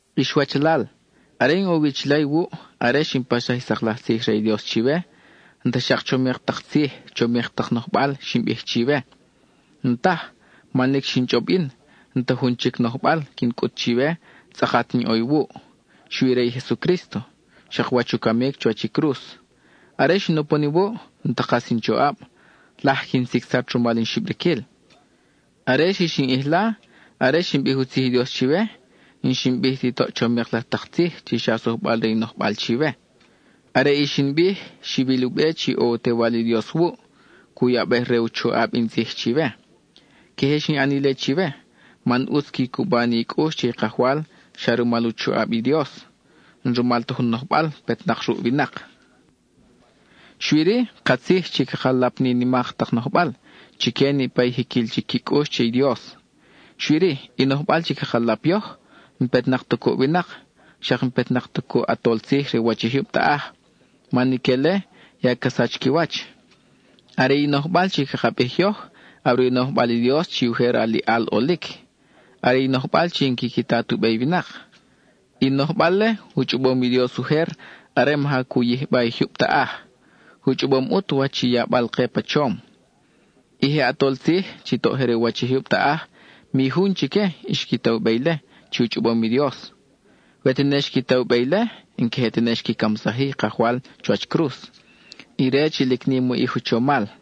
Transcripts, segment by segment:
Ix wachalal, are in ʼo wi chila iwuʼ, are xin paxsaj i sak laj tzij re i Dios chiwe, n-ta xak chomik tak tzij, chomik tak nojbal xin bij chiwe. N-taj, man lic xin chʼob yin, n-ta jun chic nojbal quin cʼut chiwe tzʼakat in ʼo iwuʼ, xui re i Jesucrísto, xak wach u camic chuwach i cruz. Are xin upon iwuʼ, n-ta kas in choʼab, laj quin sicsat rumal in xibriquil. Are xix in ʼijla, are xin bij u tzij i Dios chiwe, n-xin bij ti toʼ chomik laj tak tzij chi xa sujbal re in nojbal chiwe. Are i xin bij, xiwil u be chi ʼo u Tewal i Dios wuʼ, cu yabej re u choʼab in tzij chiwe. Queje xin ʼan ile chiwe, man ʼutz qui cuba ni i cʼux che i Kajwal xa rumal u choʼab i Dios, n-rumal ta jun nojbal petnak ruʼ winak. Xui-ri, katzij chi caka lap nimak tak nojbal chique niʼpa i jiquil chic qui cʼux che i Dios. Xui-ri, i nojbal chi caka lap yoj, n-petnak ta cuʼ winak, xak n-petnak ta cuʼ i ʼatol tzij je re u wach i jyub taʼaj, man ique-le ya ca sach qui wach. Are i nojbal chi caka bij yoj, are u nojbal i Dios chi ujer aliʼal ʼolic, are i nojbal chi n-quiqui ta tu be i winak. I nojbal-le, u chʼobom i Dios ujer are maja cu yijba i jyub taʼaj; u chʼobom ʼut wach i yabal-ke pa chom. I je ʼatol tzij, chi toʼ je re u wach i jyub taʼaj, mi jun chique xqui ta u be ile chi u chʼobom i Dios; we tene xqui ta u be ile, n-queje tene xqui camsaj-i i Kajwal chuwach cruz, ire chi lic nim u ʼij u chomal.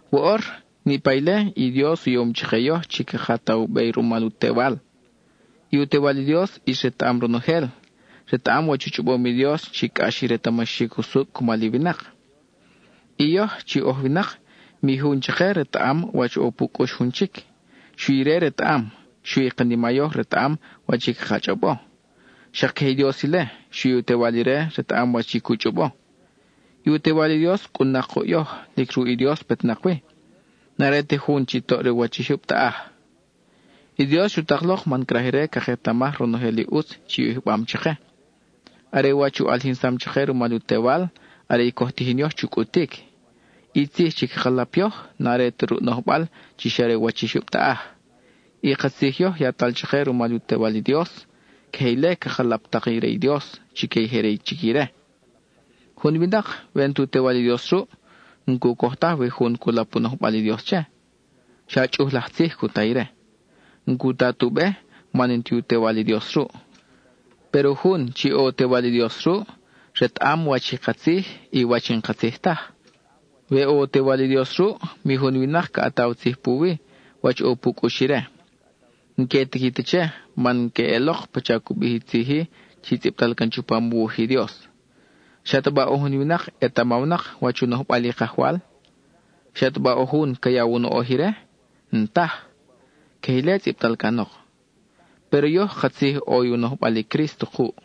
Woʼor, niʼpa ile, i Dios u yom chake yoj chi caka ta u be rumal u Tewal. I u Tewal i Dios ʼis retaʼam ronojel, retaʼam wach u chʼobom i Dios chi cʼax i retamaxic usucʼ cumal i winak. I yoj, chi oj winak, mi jun chake retaʼam wach ʼo pu cʼux jun chic, xui ire retaʼam, xui i kanima yoj retaʼam wach i caka chʼobo. Xak queje i Dios ile, xui u Tewal ire retaʼam wach i cu chʼobo. I u Tewal i Dios cʼun-nak kuʼ yoj, lic ruʼ i Dios petnak wi; n-are ta jun chi toʼ re u wach i jyub taʼaj. I Dios xu tak lok man craj ire caketamaj ronojel i ʼutz chi u yijbam chake. Are wach i u ʼalijinsam chake rumal u Tewal, are i coj tijin yoj chu cʼutic. I tzij chi caka lap yoj, n-are ta ruʼ nojbal chi xa re u wach i jyub taʼaj. I ka tzij yoj yatal chake rumal u Tewal i Dios. Queje ile caka lap tak i re i Dios chique i je re chic ire. Jun winak, we n-tu Tewal i Dios ruʼ, n-cu coj taj we jun cu lap u nojbal i Dios che; xa chʼuj laj tzij cu ta ire. N-cu ta tu be, man n-ti u Tewal i Dios ruʼ. Péro jun chi ʼo u Tewal i Dios ruʼ, retaʼam wach i katzij y wach i n-katzij taj. We ʼo u Tewal i Dios ruʼ, mi jun winak ca ʼataw tzij puwi, wach ʼo pu cʼux ire. N-que tiqui ta che, man queʼelok pacha cu bij i tzij-i chi tzʼibtal can chupam u wuj i Dios: ¿Xataba ʼo jun winak etamawnak wach u nojbal i Kajwal? ¿Xataba ʼo jun ca yaw u noʼoj ire? N-taj. (Queje ile tzʼibtal canok.) Péro yoj katzij ʼo i u nojbal i Crísto kuʼ.